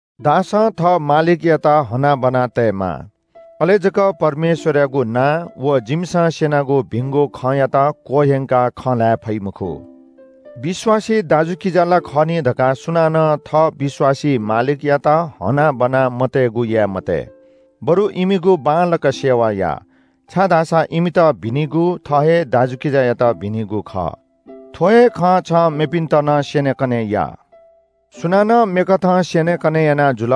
दासं थः मालिकयात हनाबना तयेमाः। अले जक परमेश्‍वरयागु नां व जिमिसं स्‍यनागु भिंगु खँयात क्‍वह्यंकाः खँ ल्‍हाये फइ मखु। विश्‍वासी दाजुकिजा ला खः नि धकाः सुनानं थः विश्‍वासी मालिकयात हनाबना मतयेगु याये मते, बरु इमिगु बांलाक सेवा या। छाय्‌धाःसा इमित भिनिगु थः हे दाजुकिजायात भिनिगु खः। थ्‍व हे खँ छं मेपिन्‍त नं स्‍यनेकने या। सुनानं मेकथं स्‍यनेकने याना जुल,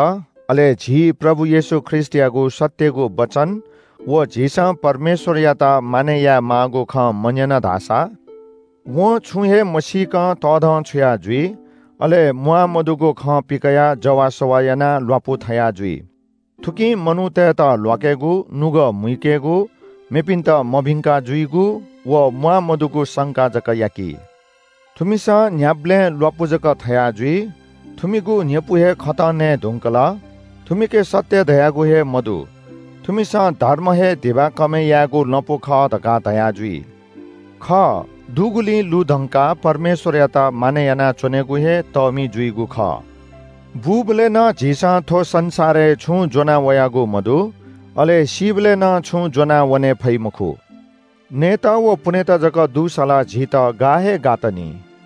अले झी प्रभु येशू ख्रीष्‍टयागु सत्‍यगु वचन व झीसं परमेश्‍वरयात मानय् यायेमाःगु खँ मन्‍यन धाःसा वं छुं हे मसीकं तःधंछुया जुइ। अले म्‍वाःमदुगु खँ पिकयाः जवाःसवाः यानाः ल्‍वापुथया जुइ। थुकिं मनूतय्‌त ल्‍वाकेगु, नुगः मुइकेगु, मेपिन्‍त मभिंका जुइगु व म्‍वाःमदुगु संका जक याकी। थुमिसं न्‍ह्याबलें ल्‍वापु जक थया जुइ, थुमिगु न्‍ह्यपु हे खतं नयेधुंकल, थुमिके सत्‍य धयागु हे मदु। थुमिसं धर्म हे धिबा कमय् यायेगु लँपु खः धकाः धयाजुइ। खः, दुगुलिं लुधंकाः परमेश्‍वरयात मानय् यानाः च्‍वनेगु हे तःमि जुइगु खः। बूबलय् नं झीसं थ्‍व संसारय् छुं ज्‍वना वयागु मदु। अले सीबलय् नं छुं ज्‍वनावने फइ मखु। नयेत व पुनेत जक दुसा ला झीत गा हे गात नि।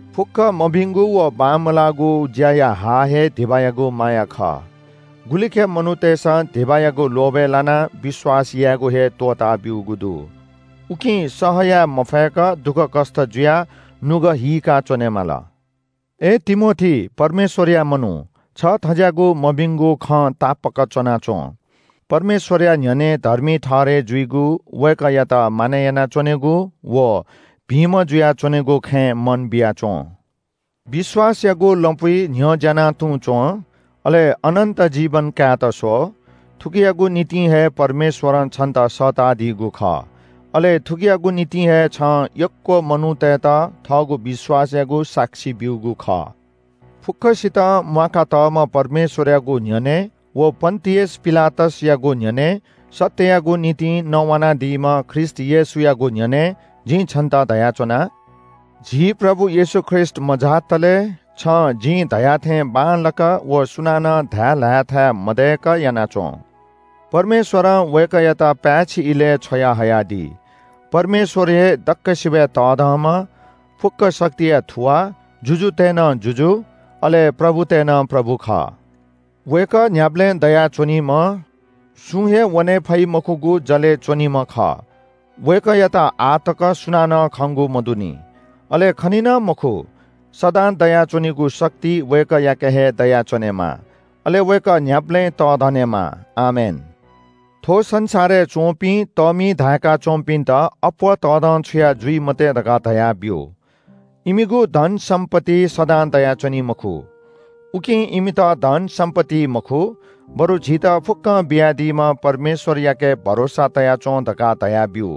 फुक्‍क मभिंगु व बांमलाःगु ज्‍याया हा हे धिबायागु माया खः। गुलिखय् मनूतय्‌सं धिबायागु लोभय् लानाः विश्‍वास यायेगु हे त्‍वःताब्‍यूगु दु। उकिं सह याये मफयेक दुःखकष्‍ट जुयाः नुगः हीका च्‍वनेमाली। अय् तिमोथी, परमेश्‍वरया मनू, छ थज्‍याःगु मभिंगु खं तापाक च्‍वनाच्‍वँ। परमेश्‍वरया न्‍ह्यःने धर्मी ठहरय् जुइगु, वय्‌कःयात मानय् यानाच्‍वनेगु व भिंम्‍ह जुयाच्‍वनेगु खँय् मन बिया च्‍वँ। विश्‍वासयागु लँपुइ न्‍ह्यज्‍याना तुं च्‍वँ। अले अनन्‍त जीवन काय्‌त स्‍व। थुकियागु निम्‍ति हे परमेश्‍वरं छन्‍त सःतादीगु खः, अले थुकियागु निम्‍ति हे छं यक्‍व मनूतय्‌त थःगु विश्‍वासयागु साक्षी ब्‍यूगु खः। फुक्‍कसितं म्‍वाका तःम्‍ह परमेश्‍वरयागु न्‍ह्यःने व पन्‍तियस पिलातसयागु न्‍ह्यःने सत्‍ययागु निंतिं नवानादीम्‍ह ख्रीष्‍ट येशूयागु न्‍ह्यःने जिं छन्‍त धयाच्‍वना – झी प्रभु येशू ख्रीष्‍ट मझातले छं जिं धया थें बांलाक व सुनानं धाये ल्‍हाये थाय् मदय्‌क याना च्‍वँ। परमेश्‍वरं वय्‌कःयात पाय्‌छि इलय् छ्वयाहयादी। परमेश्‍वर हे दक्‍वसिबय् तःधंम्‍ह, फुक्‍क शक्तिया थुवाः, जुजुतय् नं जुजु, अले प्रभुतय् नं प्रभु खः। वय्‌कः न्‍ह्याबलें दयाच्‍वनीम्‍ह, सुं हे वने फइ मखुगु जलय् च्‍वनीम्‍ह खः। वय्‌कःयात आः तक सुनानं खंगु मदुनि, अले खनी नं मखु। सदां दयाच्‍वनीगु शक्ति वय्‌कःयाके हे दयाच्‍वनेमा, अले वय्‌कः न्‍ह्याबलें तःधनेमा। आमेन। थ्‍व संसारय् च्‍वंपिं तःमि धाय्‌का च्‍वंपिन्‍त अप्‍वः तःधंछुया जुइ मते धकाः धयाब्‍यु। इमिगु धनसम्‍पत्ति सदां दयाच्‍वनी मखु। उकिं इमित धनसम्‍पत्तिइ मखु, बरु झीत फुक्‍कं बियादीम्‍ह परमेश्‍वरयाके भरोसा तया च्‍वँ धकाः धयाब्‍यु।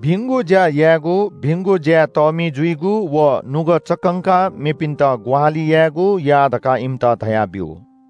भिंगु ज्‍या यायेगु, भिंगु ज्‍याय् तःमि जुइगु व नुगः चक्‍कंकाः मेपिन्‍त ग्‍वाहालि यायेगु या धकाः इमित धयाब्‍यु।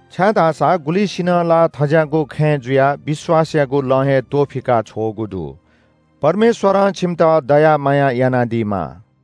छाय्‌धाःसा गुलिसिनं ला थज्‍याःगु खँय् जुयाः विश्‍वासयागु लँ हे त्‍वफिका छ्वःगु दु। परमेश्‍वरं छिमित दया माया यानादीमा।